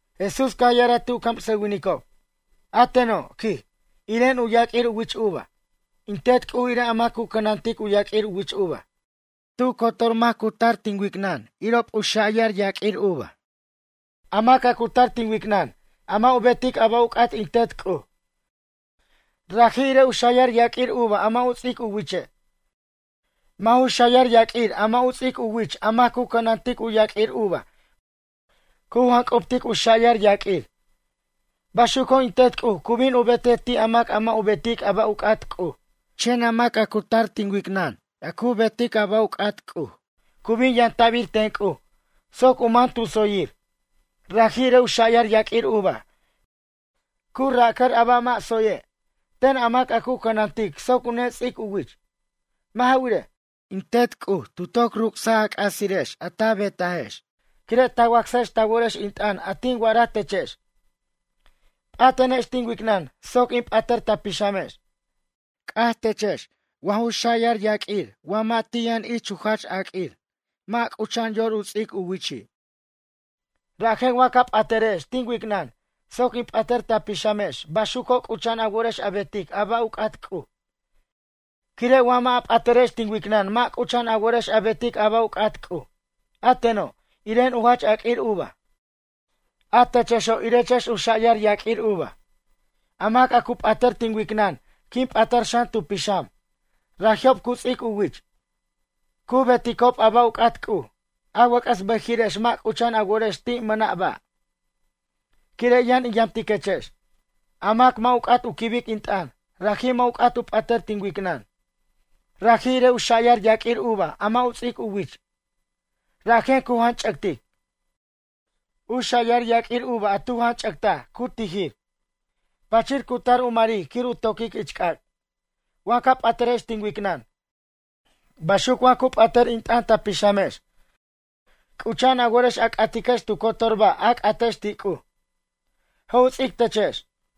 Jesús caj ya'araj ti' u camsʌwinicob: ―A teno' ―quij―, iren u yaq'uir u wich uva. In Tet C'uj irej a mac cu cʌnantic u yaq'uir u wich uva. Tu cotor mac cu tar tin wicnʌn irob u xa'yar yaq'uir uva. A mac a cu tar tin wicnʌn a mʌ' u betic a ba' u c'at in Tet C'uj, raji' irej u xa'yar yaq'uir uva a mʌ' u ts'ic u wiche'. Wa ju xa'yar yaq'uir a mʌ' u ts'ic u wich a mac cu cʌnantic u yaq'uir uva cu janc'ubtic u xa'yar yaq'uir. Baxuco' in Tet C'uj cu bin u betej ti' a mac a mʌ' u betic a ba' u c'at C'uj. Chen a mac cu tar tin wicnʌn a cu betic a ba' u c'at C'uj cu bin yamta'bir ten C'uj soc u man tu tsoyir. Raji' irej u xa'yar yaq'uir uva cu racʌr a ba' mʌ' tsoye', ten a mac a cu cʌnantic soc u nets'ic u wich. Mʌ' ja wirej, in Tet C'uj tu toc ruc'saj a c'asirex a ta betajex quire' ta wacsajex ta worex in t'ʌn a tin wa'araj techex. P'atenex tin wicnʌn soc in p'atʌr ta pixamex. C'aj techex wa ju xa'yar yaq'uir wa mʌ' ti' yʌn ich u jach aq'uir, mʌ' c'ucha'an yor u ts'ic u wichi'. Rajen, wa ca p'atʌrex tin wicnʌn soc in p'atʌr ta pixamex baxuco' c'ucha'an a worex a betic a ba' u c'at C'uj. Quire' wa mʌ' a p'atʌrex tin wicnʌn mʌ' c'ucha'an a worex a betic a ba' u c'at C'uj. ’A teno', iren u jach aq'uir uva, a techexo' irechex u xa'yar yaq'uir uva. A mac a cu p'atar tin wicnʌn quin p'atar xan tu pixam raji'ob cu ts'ic u wich, cu beticob a ba' u c'at C'uj. A wʌc'ʌs bʌjiri'ex mʌ' c'ucha'an a worex ti' mʌna' ba', quire' yʌn in yamtiquechex. A mac a mʌ' u c'at u quibic in t'ʌn, raji' mʌ' u c'at u p'atʌr tin wicnʌn. Raji' irej u xa'yar yaq'uir uva a mʌ' u ts'ic u wich. Rajen cu janch'ʌctic. U xa'yar yaq'uir uva a tu janch'ʌctaj cu tijir. Pachir cu tar u maric quir u toquic ich c'ac'. ’Wa ca p'atʌrex tin wicnʌn, baxuc wa cu p'atʌr in t'ʌn ta pixamex, c'ucha'an a worex a c'atiquex tu cotor ba' a c'atex ti' C'uj. Je' u ts'ic techex.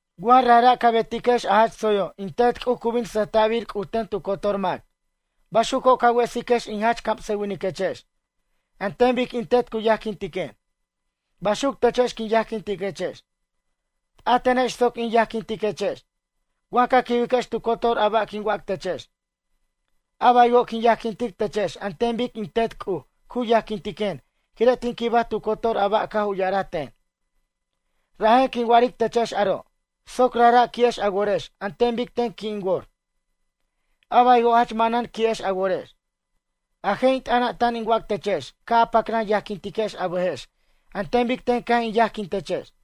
Wa rajra' ca betiquex a jach tsoyo' in Tet C'uj cu bin sʌjta'bir C'uj ten tu cotor mac. Baxuco' ca wesiquex in jach camsawiniquechex. An ten bic in Tet cu yajquintiquen, baxuc techex quin yajquintiquechex. P'atenex soc in yajquintiquechex. Wa ca quibiquex tu cotor a ba' quin wac techex. A baywo' quin yajquintic techex an ten bic in Tet C'uj cu yajquintiquen quire' tin quibaj tu cotor a ba' caj u ya'araj ten. ’Rajen quin wa'aric techex aro' soc rajra' qui'ex a worex an ten bic ten qui' in wor. A baywo' jach manan qui'ex a worex. A je' in t'ʌna' tan in wac techex ca' a pacran yajquintiquex a bʌjex an ten bic ten caj in yajquin techex.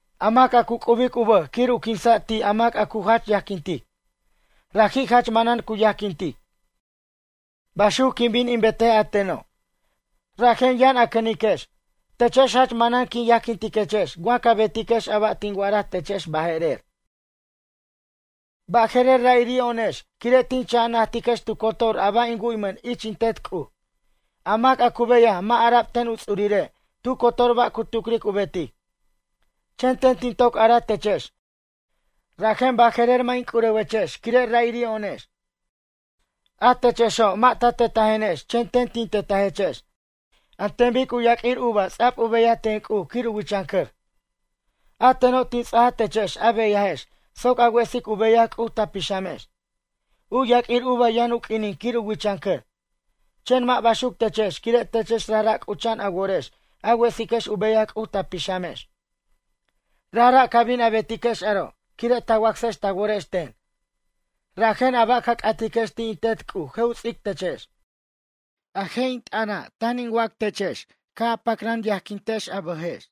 A mac a cu c'ubic u bʌj quir u quinsa' ti' a mac a cu jach yajquintic, raji' jach manan cu yajquintic. Baxuc quin bin in betej a teno', rajen yʌn cʌniquenex. Techex jach manan quin yajquintiquechex wa ca betiquex a ba' tin wa'ara techex baje'rer. Baje'rer ra'iri'o'onex quire' tin cha' a najtiquex tu cotor a ba' in wu'ymʌn ich in Tet C'uj. A mac a cu beyaj mʌ' ara'b ten u ts'urire' tu cotor ba' cu tucric u betic. Chen ten tin toc araj techex rajen baje'rer mʌ' in c'urewechex quire' ra'iri'o'onex. A techexo' mʌ' ta tetajenex chen ten tin tetajechex. An ten bic u yaq'uir uva ts'a'b u beyaj ten C'uj quir u wichʌncʌr. A teno' tin ts'aj techex a beyajex soc a wesic u beyaj C'uj ta pixamex. U yaq'uir uva yʌn u q'uinin quir u wichʌncʌr. Chen mʌ' baxuc techex quire' techex rajra' c'ucha'an a worex a wesiquex u beyaj C'uj ta pixamex. Rajra' ca bin a betiquex aro' quire' ta wacsex ta worex ten. Rajen a ba' ca c'atiquex ti' in Tet C'uj je' u ts'ic techex. A je' in t'ʌna' tan in wac techex: ca' a pacran yajquintex a bʌjex.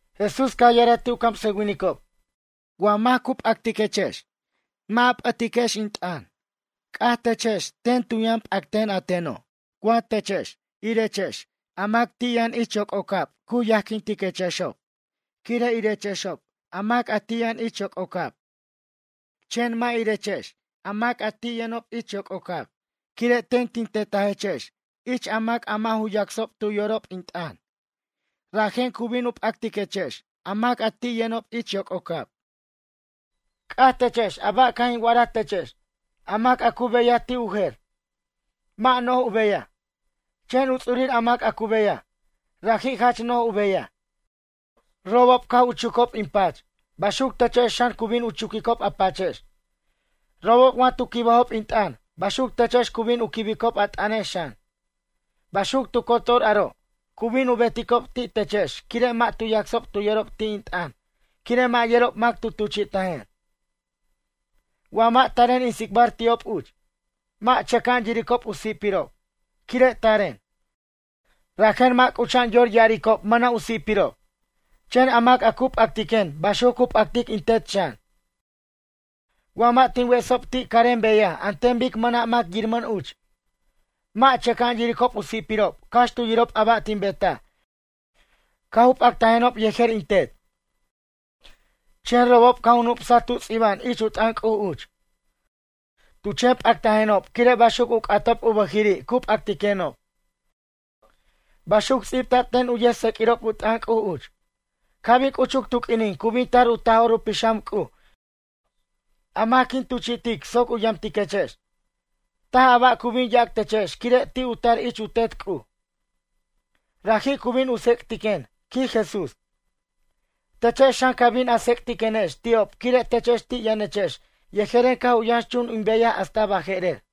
Jesús caj ya'araj ti' u camsʌwinicob: ―Wa mac cu p'actiquechex mʌ' a p'ʌtiquex in t'ʌn, c'aj techex ten tu yʌn p'acten a teno'. Wa techex irechex a mac ti' yʌn yoc'ocab cu yajquintiquechexob quire' irechexob a mac ti' yʌn yoc'ocab. Chen mʌ' irechex a mac ti' yʌnob ich yoc'ocab quire' ten tin tetajechex ich a mac a mʌ' ju yacsob tu yorob in t'ʌn. Rajen cu bin u p'actiquechex a mac ti' yʌnob yoc'ocab. C'aj techex a ba' caj in wa'ara techex: “A mac a cu beyaj ti' u jer, mʌ' no'j u beyaj. Chen u ts'urir a mac a cu beyaj, raji' jach no'j u beyaj.” Robob caj u chucob in pach, baxuc techex xan cu bin u chuquicob a pachex. Robob wa tu quibajob in t'ʌn, baxuc techex cu bin u quibicob a t'ʌnex xan. Baxuc tu cotor aro', cu bin u beticob ti' techex quire' mʌ' tu yacsob tu yorob in t'ʌn quire' mʌ' yerob mac tu tuchi'tajen. ’Wa mʌ' taren in tsicbar ti'ob uch, mʌ' chʌca'an yiricob u si'pirob. Quire' taren, rajen mʌ' c'ucha'an yor ya'aricob mʌna' u si'pirob. Chen a mac a cu p'actiquen baxuc cu p'actic in Tet xan. Wa mʌ' tin wesob ti' carem beyaj an ten bic mʌna' mac yiramʌn uch, mʌ' chʌca'an yiricob u si'pirob cax tu yirob a ba' tin betaj caj u p'actajenob yejer in Tet. Chen robob caj u nup'saj tu' ts'iba'an ich u t'ʌn C'uj uch: “Tu chen p'actajenob quire' baxuc u c'atob u bʌjiri' cu p'acticquenob.” Baxuc ts'ibta'b ten uch yʌjtseq'uirob u t'ʌn C'uj uch. ’Ca' bin c'uchuc tu q'uinin cu bin tar u Taj'or u Pixam C'uj a mac quin tuchi'tic soc u yamtiquechex. Taj a ba' cu bin yac techex quire' ti' u tar ich u Tet C'uj. Raji' cu bin u tsec'tiquen ―quij Jesús―. Techex xan ca bin a tsec'tiquenex ti'ob quire' techex ti' yʌnechex yejeren caj u yʌnxchun in beyaj hasta baje'rer.